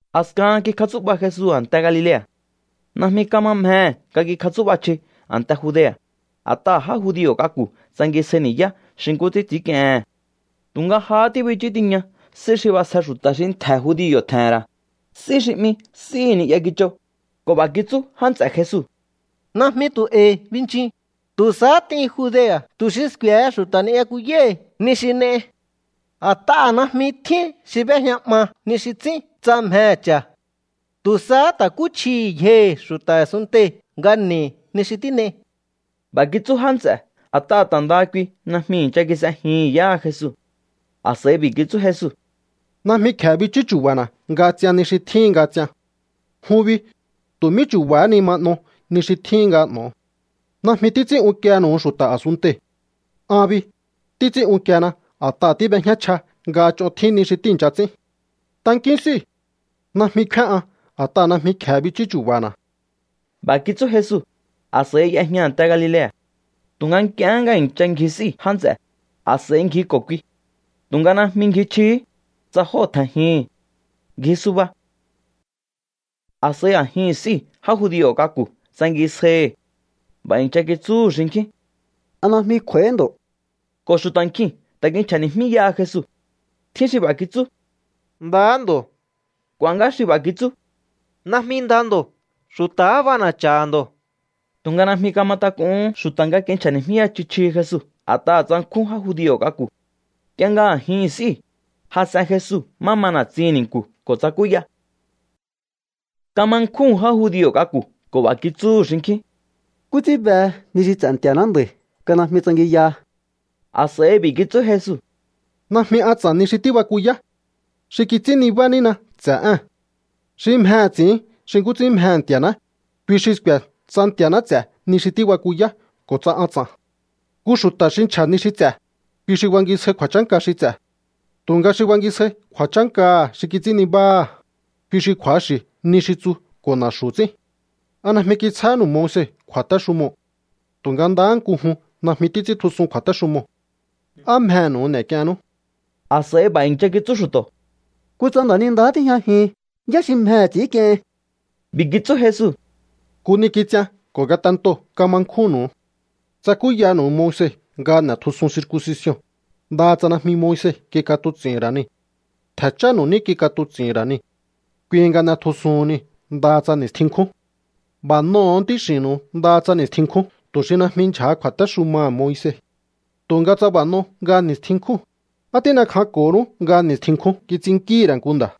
A̱skahan kikjatsú'ba Jesu a̱nte Galilea̱. Najmi kama mjehe̱ nga kikjatsú'ba chji a̱nte Judea̱, a̱t'aha̱ já judio̱ k'aku̱ tsangisjai ni̱yá xi nkú ts'ín ts'i̱ínk'iehen. Tu̱nga jahá tíbichú tiña s'í xi b'asje xu̱ta̱ xi ntje̱ judio̱ tje̱he̱n ra̱, s'í xi 'mi S'íhi̱ Ni'ya Kichoo̱, ko̱ b'a̱ kitsú já nts'e̱ Jesu: —Najmi tu̱ e̱i̱ binchin. Tu̱ sahá t'in Judea̱ tu̱ xi sku̱e̱he xu̱ta̱ ni'yakuyáhi̱ ni xi n'ei. A̱t'aha̱ najmi tjín xi b'éjña 'ma ni xi ts'ín tsa mjehe̱ cha̱. Tu̱ sahá ta̱kúchjihi̱ yjohi̱ xu̱ta̱ a̱sunntei̱ nga n'e̱i ni xi tín'ei. B'a̱ kitsú já nts'e̱ a̱t'aha̱ ta̱ ndaha kui najmi i̱ncha kis'ejihi̱n yáha Jesu. A̱s'a̱i b'i̱ kitsú Jesu: —Najmi kje̱e bichú chu̱ba̱na̱ nga ts'ian ni xi tjíhin nga ts'ian. Jun bi, tu̱ mí chu̱ba̱há ni ma n'o ni xi tjíhin nga n'o̱o. Najmi títs'ín unkienu̱u xu̱ta̱ a̱sunntei̱. An bi, títs'ín unkiena a̱t'aha̱ tíb'ejñá chja nga ch'on tjín ni xi tíi̱ncha ts'ín. Tankíún s'íu̱. Najmi kfíán an a̱t'aha̱ najmi kje̱e bichú chu̱ba̱na̱. B'a̱ kitsú Jesu, a̱s'a̱i y'ejña a̱nte Galilea̱. Tu̱nga nk'iehé nga i̱ncha ngji s'íu̱ já nts'e̱, a̱s'a̱i ngji ko̱ kui. Tu̱nga najmi ngji chjihí, tsa jóo̱ tje̱njihi̱n. Ngji suba. A̱s'a̱i a̱jin s'íu̱ já judio̱ k'aku̱ tsangisjaihi̱. B'a̱ i̱ncha kitsúhu̱ xinkjín: —¿A najmi kj'u̱a̱íhí ndo̱? Ko̱ xu̱ta̱ nkjiu̱n ta̱ kinchja̱ni̱jmíyaha Jesu. Tjín xi b'a̱ kitsú: “Ndahá ndo̱.” K'u̱a̱ ngá xi b'a̱ kitsú: “Najmi nda ndo̱. Xu̱ta̱há b'ana̱cha̱ha̱ ndo̱.” Tu̱nga najmi kama tak'uhún xu̱ta̱ kinchja̱ni̱jmíya chji chjihi Jesu a̱t'aha̱ tsankjún já judio̱ k'aku̱. Nk'ie nga a̱jihi̱n s'íu̱, jas'en Jesu má ma na̱tsihi̱n ni̱nku̱ ko̱ tsakúya. Kama nkjúhu̱n já judio̱ k'aku̱ ko̱ b'a̱ kitsúhu̱ xinkjín: —¿Nkú ts'ín behe ni xi ts'e̱ Nti̱a̱ná nda̱i̱ nga najmi tsangiyaha? A̱s'a̱i b'i̱ kitsú Jesu: —Najmi an ts'a̱n ni xi tíbakuyá. Xi kits'ín nibá nína ts'e̱ ée̱n. Xi mjehe̱ ts'i̱ín xi nkú ts'ín mjehe̱ Nti̱a̱ná, kui xi sku̱e̱ tsa Nti̱a̱ná ts'e̱ ni xi tíbakuyá ko̱ tsa an ts'a̱n. Nku xu̱ta̱ xi nchja̱ ni xi ts'e̱, kui xi bankisjai kju̱a̱chánka xi ts'e̱. Tu̱nga xi bankisjai kju̱a̱chánkaha̱ xi kits'ín nibáha̱, kui xi kju̱axi̱ ni xi tsu ko̱ na̱xu̱ ts'ín. ¿A najmi kitsjáhánu̱u Moise kju̱a̱téxumoo̱? Tu̱nga ndaha nku jun najmi títs'íntjusun kju̱a̱téxumoo̱. ¿Á mjehe̱nu̱u n'e̱k'iehennú? A̱s'a̱i b'a̱ i̱ncha kitsú xu̱to̱: —¡Kutsa nda̱nindahá tíjñajihin! ¿Yá xi mjehe̱ ts'i̱ínk'iehin? B'i̱ kitsú Jesu: —Nku ni kits'ian ko̱ ngatentoo̱ kama nkjúnnu̱u. Tsakúyanu̱u Moise nga n'e̱tjusun circuncision, ndaha tsa najmi Moise kik'atuts'i̱hi̱n ra̱ niu̱. Ntje̱ chánu̱u ní kik'atuts'i̱hi̱n ra̱ niu̱. Kui nga n'etjusuhun niu̱ ndaha tsa ni̱stjin nkjún. B'a̱ n'oho̱o ntíx'i̱nnu̱u ndaha tsa ni̱stjin nkjún tu̱ xi najmi ndyja̱ha kju̱a̱téxumaha̱ Moise. Tu̱nga tsa b'a̱ n'o nga ni̱stjin nkjúu̱n, ¿á tín'ekjanko̱honú nga ni̱stjin nkjún kits'innkíhi̱ ra̱ nku nda̱?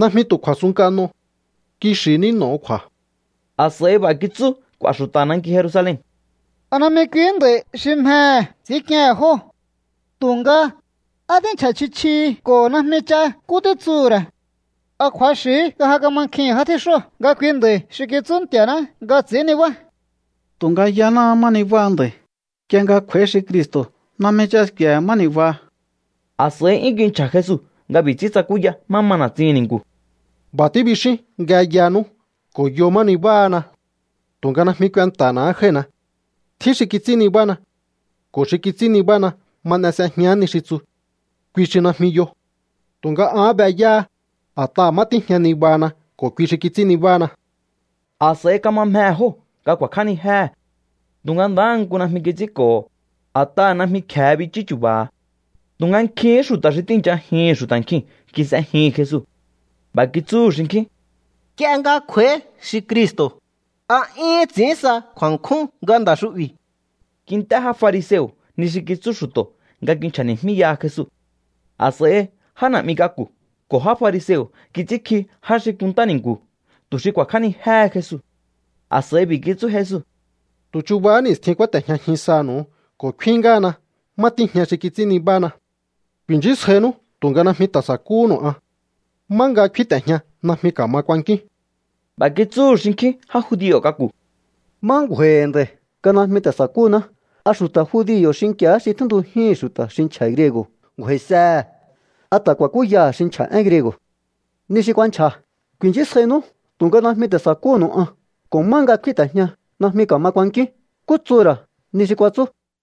Najmi tu̱ kju̱a̱ sunnk'a n'o. Kixi̱ ní n'o̱o kju̱a̱. A̱s'a̱i b'a̱ kitsú k'u̱a̱ xu̱ta̱ nanki Jerusalen: —¿A najmi kuihí nda̱i̱ xi mjehe̱ ts'i̱ínk'iehe̱n jóo̱? Tu̱nga, á tínchja̱ chji chjihi ko̱ najmi ch'a nkú títsuhu̱ ra̱. ¿A kju̱axi̱hí nga ja kamankjihi̱n já tjíxóo̱ nga kui nda̱i̱ xi kitsú Nti̱a̱ná nga ts'i̱ín nibá? Tu̱nga yanáá má nibáha nda̱i̱. Nk'ie nga kj'u̱a̱í xi Cristo̱, najmi ch'a sku̱e̱ má ni̱baha. A̱s'a̱i 'yún kinchja̱ Jesu nga b'i̱ ts'ín tsakúya má ma na̱tsihi̱n ni̱nku̱: —B'a̱ tíbixíún nga yanú ko̱ yo má nibáhana. Tu̱nga najmi kuenta̱na̱há jái̱hina. Tjín xi kits'ín nibána. Ko̱ xi kits'ín nibána ma n'e s'ejián ni xi tsu. Kui xi najmi yo. Tu̱nga an be yáha, a̱t'aha̱ má tíjña nibahana ko̱ kui xi kits'ín nibána. A̱s'a̱i kama mjehe̱ jóo̱ nga ku̱a̱kj'ánijéhe̱. Tu̱nga ndahá nku najmi kits'ínko̱ho̱, a̱t'aha̱ najmi kje̱e bichú chu̱ba̱ha̱. Tu̱nga nkjin xu̱ta̱ xi tíi̱nchajihi̱n xu̱ta̱ nkjiu̱n kis'ejihi̱n Jesu. B'a̱ kitsúhu̱ xinkjín: —Nk'ie nga kj'u̱a̱í xi Cristo̱, ¿a 'yún ts'i̱ín sa kju̱a̱nkjún nga nda̱ xu'bi̱? Kint'é já fariseo̱ ni xi kitsú xu̱to̱ nga kinchja̱ni̱jmíyaha Jesu. A̱s'a̱i já na̱'mi k'aku̱ ko̱ já fariseo̱ kits'ínkji já xi kunntá ni̱nku̱ tu̱ xi ku̱a̱kj'ánijéhe Jesu. A̱s'a̱i b'i̱ kitsú Jesu: —Tu̱ chuba ni̱stjihín kúáte̱jñajin sanu̱u ko̱ kfín ngáhana má tíjña xi kits'ín nibána. Ku̱i̱nchísjainú tu̱nga najmi ta̱ sa̱kúhu̱nu̱u an. Má nga kfínte̱jña najmi ka̱ma kuankíún. B'a̱ kitsúhu̱ xinkjín já judio̱ k'aku̱: —¿Má ngju̱a̱i̱hi̱ nda̱i̱ nga najmi ta̱ sa̱kúhuná? ¿A xu̱ta̱ judio̱ xinki̱á xi tjíntujíhi̱n xu̱ta̱ xi nchja̱ griego̱ ngju̱a̱i̱sehe̱? ¿A ta̱ ku̱a̱kúyaha̱ xi nchja̱ én griego̱? Ni xi kuanchja̱: “Ku̱i̱nchísjainú tu̱nga najmi ta̱ sa̱kúhu̱nu̱u an”, ko̱: “Má nga kfínte̱jña najmi ka̱ma kuankíún”, ¿nkú tsuhu̱ ra̱ ni xi kuatsú?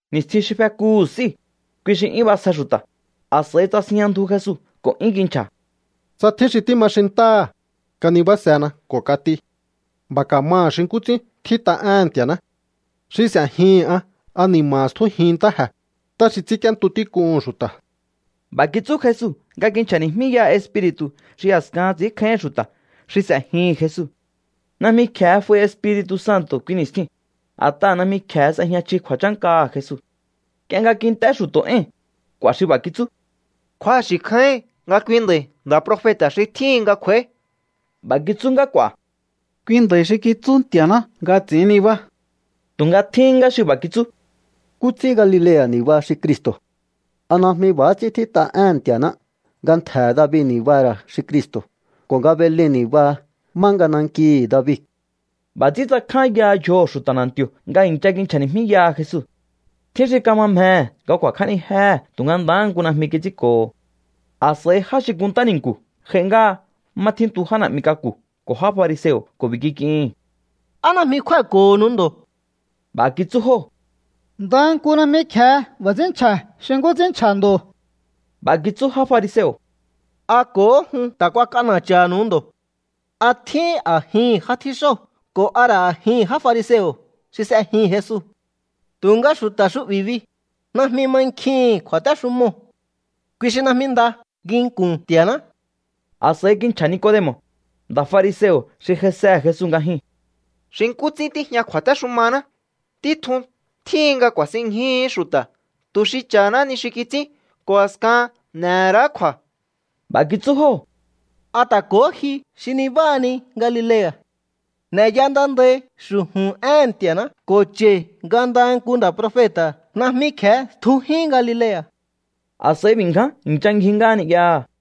Ni̱stjin xi fekuhu̱ s'íu̱, kui xi 'yún b'asje xu̱ta̱, a̱s'a̱i tsasinjña ndju Jesu ko̱ 'yún kinchja̱: —Tsa tjín xi tíma xintáha̱, kanibásena ko̱ kat'i. B'a̱ ka̱maha̱ xi nkú ts'ín tjít'a éhe̱n Nti̱a̱ná. Xi s'e̱jihi̱n an ani̱ma̱ha̱ stjújin ntáje̱, ntá xi ts'ínk'íéntu tík'uhu̱n xu̱ta̱. B'a̱ kitsú Jesu nga kinchja̱ni̱jmíyaha Espiri̱tu̱ xi a̱skahan ts'i̱ínkjáíhi̱n xu̱ta̱ xi s'e̱jihi̱n Jesu. Najmi kje̱e f'ai Espiri̱tu̱ Santo̱ kui ni̱stjiu̱n, a̱t'aha̱ najmi kje̱e s'e̱jña chji kju̱a̱chánkaha̱ Jesu. Nk'ie nga kint'é xu̱to̱ éi̱n, k'u̱a̱ xi b'a̱ kitsú: —Kju̱axi̱ kjáíhin nga kui nda̱i̱ nda̱ profeta̱ xi tjíhin nga kj'u̱a̱í. B'a̱ kitsú ngá k'u̱a̱: —Kui nda̱i̱ xi kitsú Nti̱a̱ná nga ts'i̱ín nibá. Tu̱nga tjín ngá xi b'a̱ kitsú: —¿Nkú ts'ín Galilea̱ ni̱baha xi Cristo̱? ¿A najmi b'a̱há ts'ín tjít'a éhe̱n Nti̱a̱ná, nga ntje̱he̱ David ni̱baha̱ ra̱ xi Cristo̱, ko̱ nga Belen ni̱baha, má nga nankihi̱ David? B'a̱ ts'ín tsakjányaha yjoho̱ xu̱ta̱ na̱nti̱o̱ nga i̱ncha kinchja̱ni̱jmíyaha Jesu. Tjín xi kama mjehe̱ nga ku̱a̱kj'ánijéhe̱ tu̱nga ndahá nku najmi kits'ínko̱ho̱. A̱s'a̱i já xi kunntá ni̱nku̱ j'ai ngáha má tjíntu já na̱'mi k'aku̱ ko̱ já fariseo̱ ko̱ b'i̱ kik'ihi̱n: —¿Á najmi kjúái̱ko̱honu ndo̱? B'a̱ kitsú jóo̱: —Ndaha nku najmi kje̱e b'a̱ ts'ín nchja̱ xi nkú ts'ín nchja̱ ndo̱. B'a̱ kitsú já fariseo̱: —¿A ko̱hó jun ta̱ kuak'ana̱cha̱nu̱u ndo̱? ¿A tjíhín a̱jihi̱n já tjíxóo̱ ko̱ a ra̱ a̱jihi̱n já fariseo̱ xi s'ejihi̱n Jesu? Tu̱nga xu̱ta̱ xu'bi̱ bi, najmi mankjihi̱n kju̱a̱téxumoo̱. Kui xi najmi nda nginku̱n Nti̱a̱ná. A̱s'a̱i kinchja̱ Nicodemo̱, nda̱ fariseo̱ xi j'aisehe̱ Jesu nga jyuu̱n: —Xi nkú ts'ín tíjña kju̱a̱téxumaná, títjun tjíhin nga ku̱a̱sinñjuhu̱ú xu̱ta̱ tu̱ xi cha̱haná ni xi kits'ín ko̱ a̱skahan n'e̱ ra̱á kju̱a̱. B'a̱ kitsú jóo̱: —¿A ta̱ ko̱hó ji xi nibáhani Galilea̱? N'e̱ya nda ndai xu̱ju̱n éhe̱n Nti̱a̱ná ko̱ cha̱i̱ nga ndaha nku nda̱ profeta̱ najmi kje̱e tjujín Galilea̱. A̱s'a̱i b'i̱ ngján i̱ncha ngji ngáha ni'yaha̱.